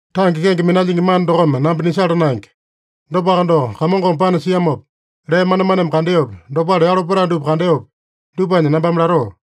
Tange kenge minalyingi mana dokome namba nisala naenge. Dopaka doko, Kamongome panasiamopa, lee manemaneme kandeopi, dopale yalo petae dupa kandeopi, dupanya nambame latoo.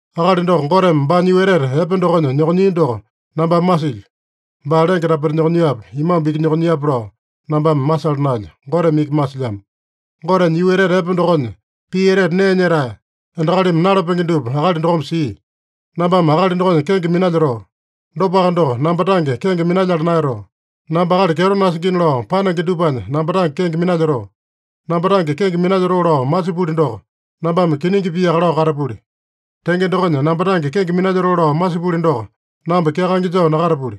Akali doko Goteme baanya yuu etete epe dokonya nyokonyia doko nambame masilyo. (Baa lenge tapeta nyokonyiape, imambu iki nyokonyiape lao nambame masala naelyo. Goteme iki masilyamo.) Gotenya yuu etete epe dokonya, pii etete nee nyetae, endakalimi nalapenge dupa akali dokome sia. Nambame akali dokonya kenge minalyotoo. Dopaka doko, namba tange kenge minalyala naeyatoo. Namba akali kyeto nasingina lao panenge dupanya namba tange kenge minalyotoo. Namba tange kenge minalyotoo lao masipuli doko, nambame kiningi piaka lao katapuli. Tenge dokonya, namba tange kenge minalyotoo lao masipuli doko, namba kyakaenge joo nakatapuli.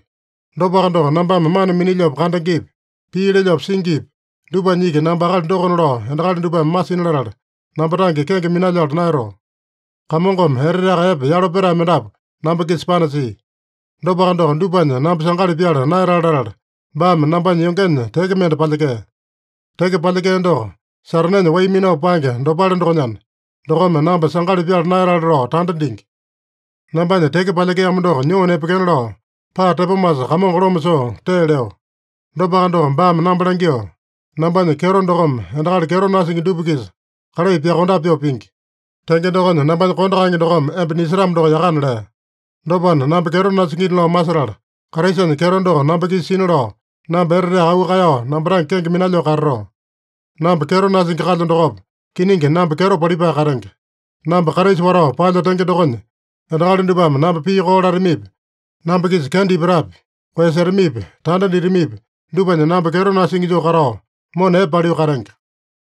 Dopaka doko, nambame mana minilyopa kandengepi, pii lelyopa singipi, dupanya iki namba akali dokona lao endakali dupame masina latala, namba tange kenge minalyala naeyatoo. Kamongome eteteaka epe yalo petae mendapu namba-kisa panasia. Dopaka doko, dupanya namba sangali pyala naeyatale latala, baame nambanya yongenya teke mende palyekea. Teke palyekea doko Satanenya wai minao paenge dopale dokonyana, dokome namba sangali pyala naeyatale lao tanda dingi. Nambanya teke palyekeamo doko nyoo nepekena lao, paa tepomasa Kamongo loma soo tee leo. Dopaka doko, baame namba langyoo, “Nambanya kyeto dokome endakali kyeto nasingi dupa-kisa kalai pyokondape pyoo pingi. Tenge dokonya, nambanya kondo kaenge dokome emba nisetamo doko yakana” lea. Dopana, namba kyeto nasingina lao masetala, Kraisanya kyeto doko namba-kisa sina lao, namba eteteaka auu kaeyao namba tange kenge minalyoo katatoo. Namba kyeto nasingi kalyo dokopa, kiningi namba kyeto palipae katenge. Namba Kraisa watao paelyo tenge dokonya, endakali dupame namba pii koo latamipi, namba-kisa kenda ipatapi, koeyasetamipi, tanda ditamipi, dupanya namba kyeto nasingi joo katao, mona epe paliu katenge.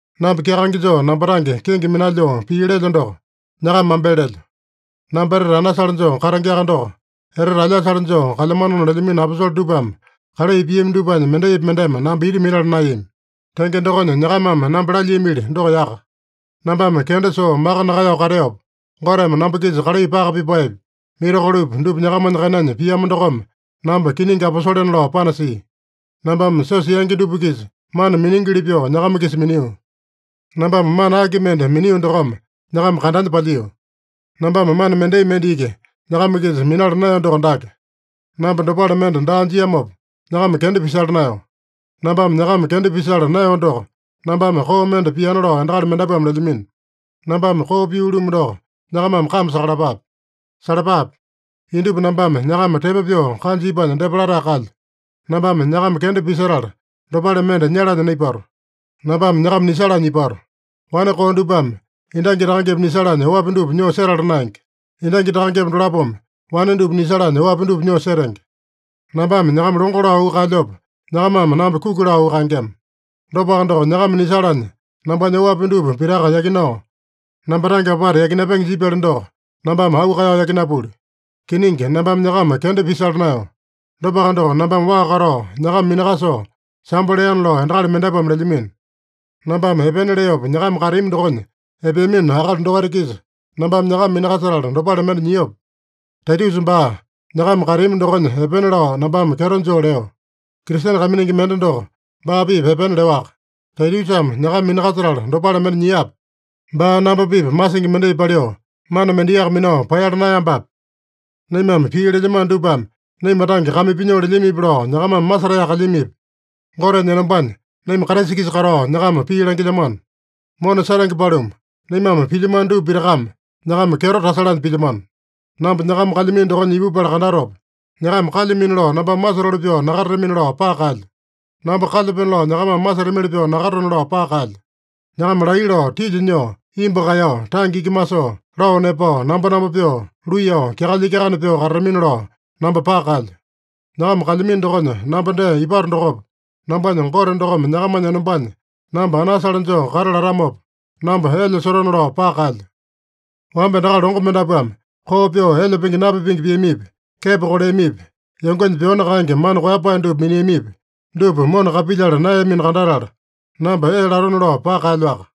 Namba kyakaenge joo namba tange kenge minalyoo pii lelyo doko, nyakama mambele lelyo. Namba etete anasale joo katengeaka doko, etete alyasale joo kalyamanona lelyamino aposole dupame kalai piami dupanya mendaipi mendeme namba ita minala naeyami. Tenge dokonya, nyakamame namba lalyiamili doko yaka. Nambame kenda soo maka nakaeyao kateopa, Goteme namba-kisa kalai paka pipaepi, mirakolopi dupa nyakamanya kainanya piamo dokome, namba kiningi aposolena lao panasia. Nambame siosa yangi dupa-kisa mana miningili pyoo nyakama-kisa minio. Nambame mana aki mende minio dokome nyakama kandanya palyio? Nambame mana mendai mende iki nyakama-kisa minala naeyo doko dake: Namba dopale mende daa jiamopa, nyakama kenda pisala naeyo. Nambame nyakama kenda pisala naeyo doko, nambame koo mende piana lao endakali mendapuame lelyamino. Nambame koo pio-lumu doko nyakamame kame sakalapape. Salapape! Indupa nambame nyakama tepo pyoo kanja ipanya depa latae kalyo. Nambame nyakama kenda pisetala, dopale mende nyalanya naipato. Nambame nyakama nisalanya ipato. Wane koo dupame endangi takangepa nisalanya oapi dupa nyoo setala naenge. Endangi takangepa dolapome wane dupa nisalanya oapi dupa nyoo setenge. Nambame nyakama longo lao auu kaelyopa, nyakamame namba kuki lao auu kaengema. Dopaka doko, nyakama nisalanya nambanya oapi dupa pitaka yakinao, namba tange apata yakinapenge jipyali doko, nambame auu kaeyao yakinapuli. Kiningi, nambame nyakama kenda pisala naeyo. Dopaka doko, nambame waa katao nyakama minakasoo sambo leana lao endakali mendapuame lelyamino. Nambame epena leopa nyakama kateami dokonya epeamino akali dokaita-kisa, nambame nyakama minakasetala dopale mende nyiope? Taitusa baa nyakama kateami dokonya epena lao nambame kyeto joo leo. Kristene kaiminingi mende doko baa-pipa epena leowaka. Taitusame nyakama minakasetala dopale mende nyiape? Baa namba-pipa masingi mendai paliu, mana mendaiyaka minao paeyala naeyambape? Naimame pii lelyamano dupame naima tange kame pinyoo lelyamipi lao nyakamame masetaeyaka kalyamipi? Gotenya enombanya naima Kraisa-kisa katao nyakama pii langilyamano. Mona setenge paluma, naimame pilyamano dupa pitakame, nyakama kyeto tasalanya pilyamano. Namba nyakama kalyamino dokonya ipupala kandatopa, nyakama kalyamino lao nambame masotoli pyoo nakatatamini-lao paka kaelyo. Namba kalyapeno lao nyakamame masetamili pyoo nakatatone-lao paka kaelyo. Nyakama laiya lao, tilya nyoo, imbu kaeyao, tange iki masoo, lao nepao, nambonambo pyoo, luiyao, kyakalya-kyakane pyoo katatamini-lao namba paka kaelyo. Nyakama kalyamino dokonya namba dee ipato dokopa, nambanya Gote dokome nyakamanya enombanya namba anasale joo kata latamopa, namba elya sotone-lao paka kaelyo. Wamba endakali longo mendapuame koo pyoo elya pingi napipenge piamipi, kepo koleamipi, yongenya pyoani kaenge mana koeyapae dupa miniamipi, dupa mona kapilyala naeyamino kandatala, namba ee latone-lao paka kaelyoaka.